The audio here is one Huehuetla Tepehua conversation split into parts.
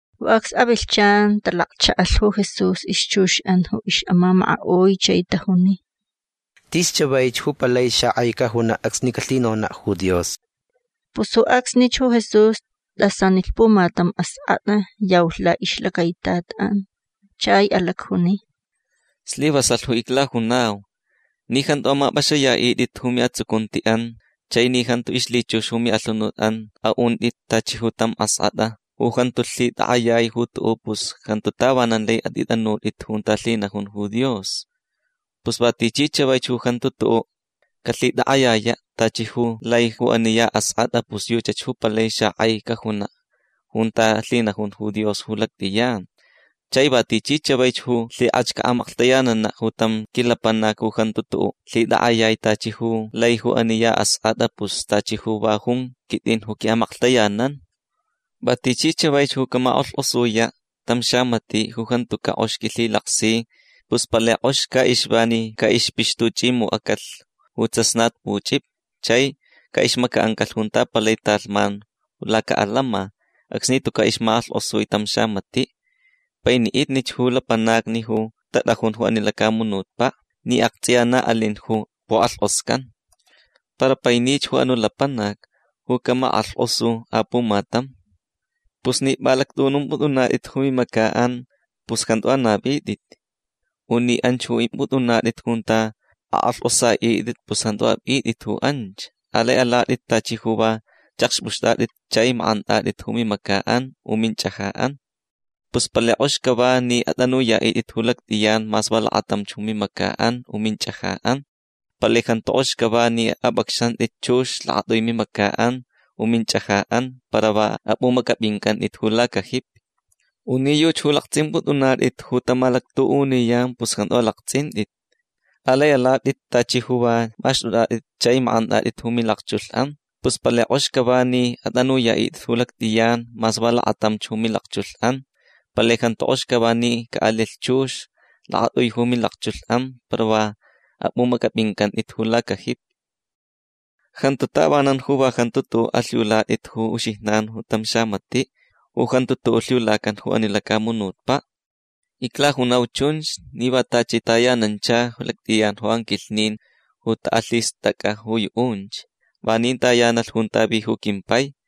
Ju acs avilhchan talakchaʼalh ju Jesús ixchuxʼan ju ixʼamamakaʼui chai tajuni: ―Tis chavaich ju palai xakʼai cajunaʼ acsni calhinonaʼ ju Dios. Pus ju acsnich ju Jesús tʼasanilh pumatam askʼatʼa. Yaulh laʼixlacaitatʼan. Chai alacjuni: ―Slivasalh ju iclajunau. Ni jantu amapʼaxayaʼitʼit ju miʼatsucuntiʼan chai ni jantu ixlhichux ju miʼalhunutʼan aʼuntʼit tachi ju tam askʼatʼa ju jantu lhitakʼayai ju tuʼuʼ pus jantu tavanan lai atʼitʼanutʼit junta lhinajun ju Dios. Pus va tichi chavaich ju jantu tuʼuʼ calhitakʼayayaʼ tachi ju lai ju ani ya askʼatʼa pus yuchach ju palai xakʼai cajunaʼ junta lhinajun ju Dios ju lactʼiyan. Chai va tichi chavaich ju lhikʼach caʼamaklhtayananaʼ ju tam quilapanac ju jantu tuʼuʼ lhitakʼayai tachi ju lai ju ani ya askʼatʼa pus tachi ju va jun quitʼin ju quiʼamaklhtayanan. Va tichi chavaich ju camakʼalhkʼosuyaʼ tam xamatiʼ ju jantucaʼ kʼox quilhilaksi pus palai kʼox caʼixva ni caʼixpixtuchʼimucʼacalh ju tsasnatpuchʼipi chai caʼixmacaʼancalh junta palai talhman lacaʼalama acsni tucaʼ ixmakʼalhkʼosui tam xamatiʼ. Painiʼitnich ju lapanacni ju tatʼajun ju ani lacamunutpaʼ ni aktsʼiya na alin ju pukʼalhkʼoscan. Para painich ju anuʼ lapanac ju camakʼalhkʼosu apumatam. Pus ni pʼalactʼuʼunumpʼutʼunatʼit ju mimacaʼan pus jantu anavitʼit. U ni anch ju pʼimpʼutʼunatʼit junta akʼalhkʼosaʼitʼit pus jantu apʼitʼit ju anch. Alai alatʼit tachi ju va chʼakxpʼuxtʼatʼit chai makʼantʼatʼit ju mimacaʼan u minchʼajaʼan. Pus palai kʼox cava ni atʼanuyaʼitʼit ju lactʼiyan mas va lakatamch ju mimacaʼan u minchʼajaʼan. Palai jantu kʼox cava ni apʼacxantʼit chux lakatʼui mimacaʼan u minchʼajaʼan para va apʼumacʼapʼincʼantʼit ju lacajipi. U ni yuchi ju laktsʼimpʼutʼunatʼit ju tamalactuʼuniyan pus jantu alaktsʼintʼit. Alai alatʼit tachi ju va maxtʼutʼatʼit chai makʼantʼatʼit ju milakchulhʼan. Pus palai kʼox cava ni atʼanuyaʼitʼit ju lactʼiyan mas va lakatamch ju milakchulhʼan. Palai jantu kʼox cava ni caʼalilh chux lakatʼui ju milakchulhʼan para va apʼumacʼapʼincʼantʼit ju lacajipi. Jantu tavanan ju va jantu tuʼuʼ alhiulatʼit ju uxijnan tam xamatiʼ ju jantu tuʼuʼ lhiulacan ju ani lacamunutpaʼ. Iclajunau chunch ni va tachi tayanancha lactʼiyan ju anquilhnin ju taʼalhistʼacʼa ju yuʼunch. Vanin tayanalh junta vi ju quimpai.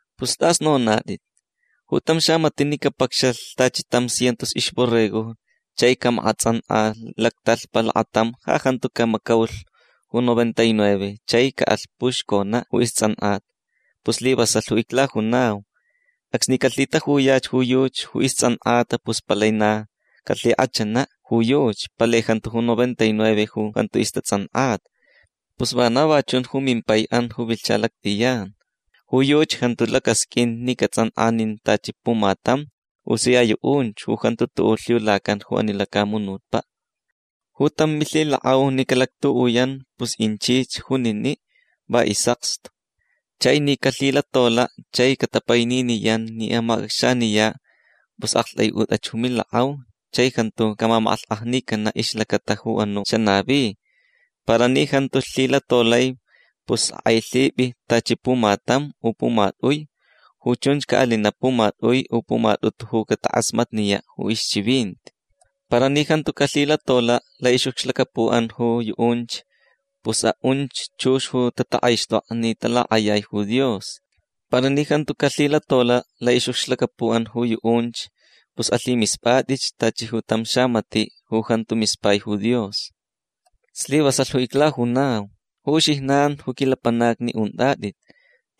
Pus tʼas nonatʼit. Ju tam xamatiʼ ni capacxalh tachi tam cientos ixborregojni chai ni camakʼatsʼankʼa lactalhpa lakatam ja jantu camacaulh ju noventa y nueve chai caʼalh puxconaʼ ju istsʼankʼata. Pus slivasalh ju iclajunau. Acsni calhitajuyach ju yuchi ju istsʼankʼata pus palai na calhikʼachanaʼ ju yuchi. Palai jantu ju noventa y nueve ju jantu istatsʼankʼata. Pus vana va chun ju mimpaiʼan ju vilhcha lactʼiyan. Ju yuchi jantu lacasqʼuin ni catsʼankʼa nin tachi pumatam ju sia yuʼunch ju jantu tuʼuʼ lhiulacan ju ani lacamunutpaʼ. Ju tam milhilakʼau ni calactuʼuyan pus inchich juniniʼ va isʼakstu. Chai ni calhilatolaʼ chai catapaininiyan ni amacʼacxaniyaʼ pus aktʼaiʼutʼach ju milakʼau chai jantu camamakʼalhkʼajnicanaʼ ixlacata ju anuʼ xanavi. Para ni jantu lhilatolai pus akʼailhipʼi tachi pumatam u pumatʼui. Ju chunch caʼalinaʼ pumatʼui u pumatʼutu ju catakʼasmatniyaʼ ju ixchivinti. Para ni jantu calhilatolaʼ laʼixʼucxlacapuʼan ju yuʼunch pus aʼunch chux ju tatakʼaixtʼokʼa ni talakʼayai ju Dios. Para ni jantu calhilatolaʼ laʼixʼucxlacapuʼan ju yuʼunch pus alhimispʼatʼich tachi tam xamatiʼ ju jantu mispai ju Dios. Slivasalh ju iclajunau ju uxijnan ju quilapanacni untʼatʼit.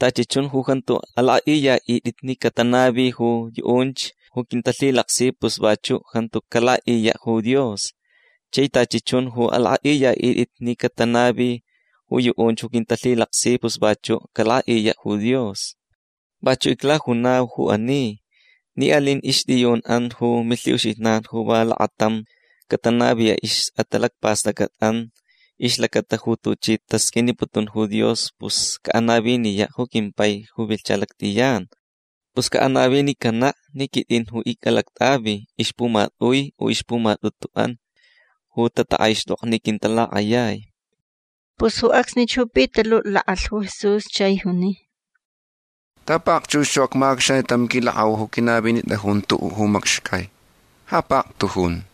Tachi chun ju jantu alakʼaʼiyaʼitʼit ni catanavi ju yuʼunch ju quintalhilaksi pus vachuʼ jantu calakʼaʼiyaʼ ju Dios. Chai tachi chun ju alakʼaʼiyaʼitʼit ni catanavi ju yuʼunch ju quintalhilaksi pus vachuʼ calakʼaʼiyaʼ ju Dios. Vachuʼ iclajunau ju ani. Ni alin ixtʼiyunʼan ju milhiʼuxijnan ju va lakatam catanaviyaʼ ixʼatalacpastʼacʼatʼan ixlacata ju tuchi tasqʼuiniputun ju Dios pus caʼanaviniyaʼ ju quimpai ju vilhcha lactʼiyan. Pus caʼanavinicanaʼ ni quitʼin ju icʼalactʼavi ixpumatʼui u ixpumatʼutuʼan ju tatakʼaixtokta ni quintalakʼayai. Pus ju acsnich ju Pitaluʼ lakʼalh ju Jesús chai juni: ―Ta pakchux ju acmacʼacxaniyaʼ tam quilakʼau ju quinavinitʼajun tuʼuʼ macxcai. Ja paktujun.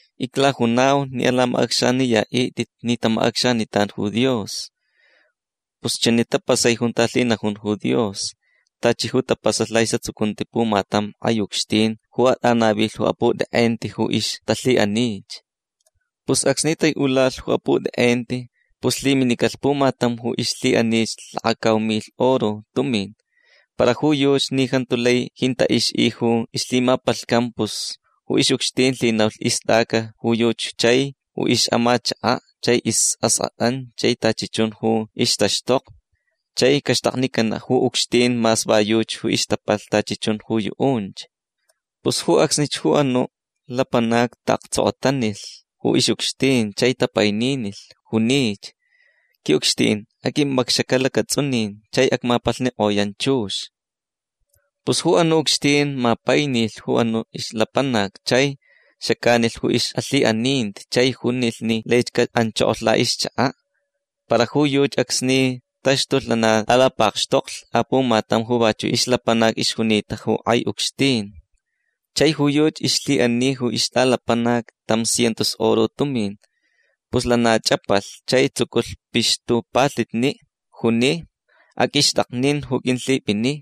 Iclajunau ni alamacʼacxayaʼitʼit ni tamacʼacxanitan ju Dios. Pus chani tapasai junta lhinajun ju Dios tachi ju tapasalh laʼisʼatsucunti pumatam kʼai ucxtin ju atʼanavilh ju aputʼekʼenti ju ixtalhiʼanich. Pus acsni taiʼulalh ju aputʼekʼenti pus lhiminicalh pumatam ju ixlhiʼanich lakacau milh oro tumin. Para ju yuchi ni jantu lai jintaʼ ixʼi ju ixlhimapalhcan pus ju ixʼucxtin lhinaulh istʼaca ju yuchi chai ju ixʼamachakaʼ chai isʼaskʼatʼan chai tachi chun ju ixtaxtokni. Chai caxtaknicanaʼ ju ucxtin mas va yuchi ixtapalh tachi chun ju yuʼunch. Pus ju acsnich ju anuʼ lapanac taʼaktsokotanilh ju ixʼucxtin chai tapaininilh. Junich: “Quiʼucxtin aqʼuimpʼacxacaʼ lacatsʼunin chai acmapalhnikʼoyan chux”. Pus ju anuʼ ucxtin mapainilh ju anuʼ ixlapanac chai xacanilh ju ixʼalhiʼaninti chai junilh ni laich caʼanchokolh laʼixchakaʼ. Para ju yuchi acsni taxtulh lana tʼalapakxtoklh apumatam ju vachuʼ ixlapanac ixjunita ju kʼai ucxtin. Chai ju yuchi ixlhiʼani ixtʼaxalapanac tam cientos oro tumin. Pus lana chʼapalh chai tsuculh pixtupalhitni. Juni: “Aqʼuixtʼaknin ju qʼuilhipʼini”.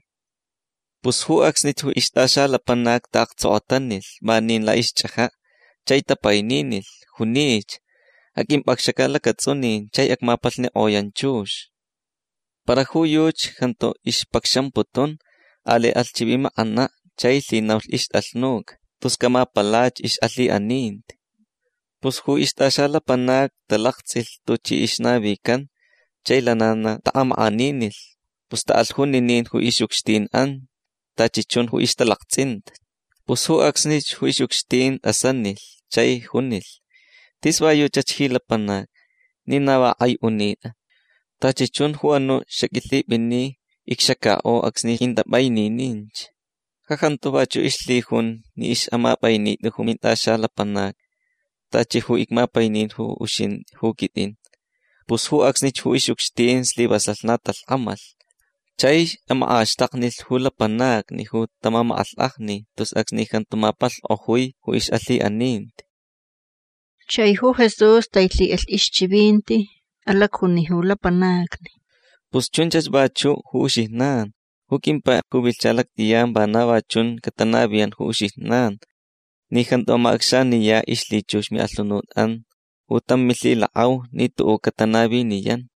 Pus ju acsnich ju ixtʼaxalapanac taʼaktsokotanilh vanin laʼixchʼajaʼ chai tapaininilh. Junich: “Aqʼuimpʼacxacaʼ lacatsʼunin chai acmapalhnikʼoyan chux”. Para ju yuchi jantu ixpacxamputun. Alai alh chivimakʼanaʼ chai lhinaulh ixtʼalhnuca tus camapalach ixʼalhiʼaninti. Pus ju ixtʼaxalapanacni talaktsʼilh tuchi ixnavican chai lana na taʼamakʼaninilh. Pus taʼalh juninin ju ixʼucxtinʼan tachi chun ju ixtalaktsʼinta. Pus ju acsnich ju ixʼucxtin tʼasanilh chai junilh: “Tis va yuchach ji lapanac ni na va kʼai unitʼa. Tachi chun ju anuʼ ju xaqʼuilhipʼini icxacakʼo acsni qʼuintʼapʼainininch. Ja jantu vachuʼ ixlhijun ni ixʼamapʼainitʼi ju mintʼaxalapanac tachi ju icmapainin ju uxintʼi ju quitʼin”. Pus ju acsnich ju ixʼucxtin slivasalh na talhkʼamalh. Chai makʼaxtaknilh ju lapanacni ju tamamakʼalhkʼajni tus acsni jantu mapalhkʼojui ju ixʼalhiʼaninti. Chai ju Jesús tailhiʼalh ixchivinti. Alacjuni ju lapanacni: ―Pus chunchach vachuʼ ju uxijnan. Ju quimpai ju vilhcha lactʼiyan vana va chunch catanaviyan ju uxijnan ni jantu amacʼacxaniyaʼ ixlhichux miʼalhunutʼan ju tam milhilakʼau ni tuʼuʼ catanaviniyan.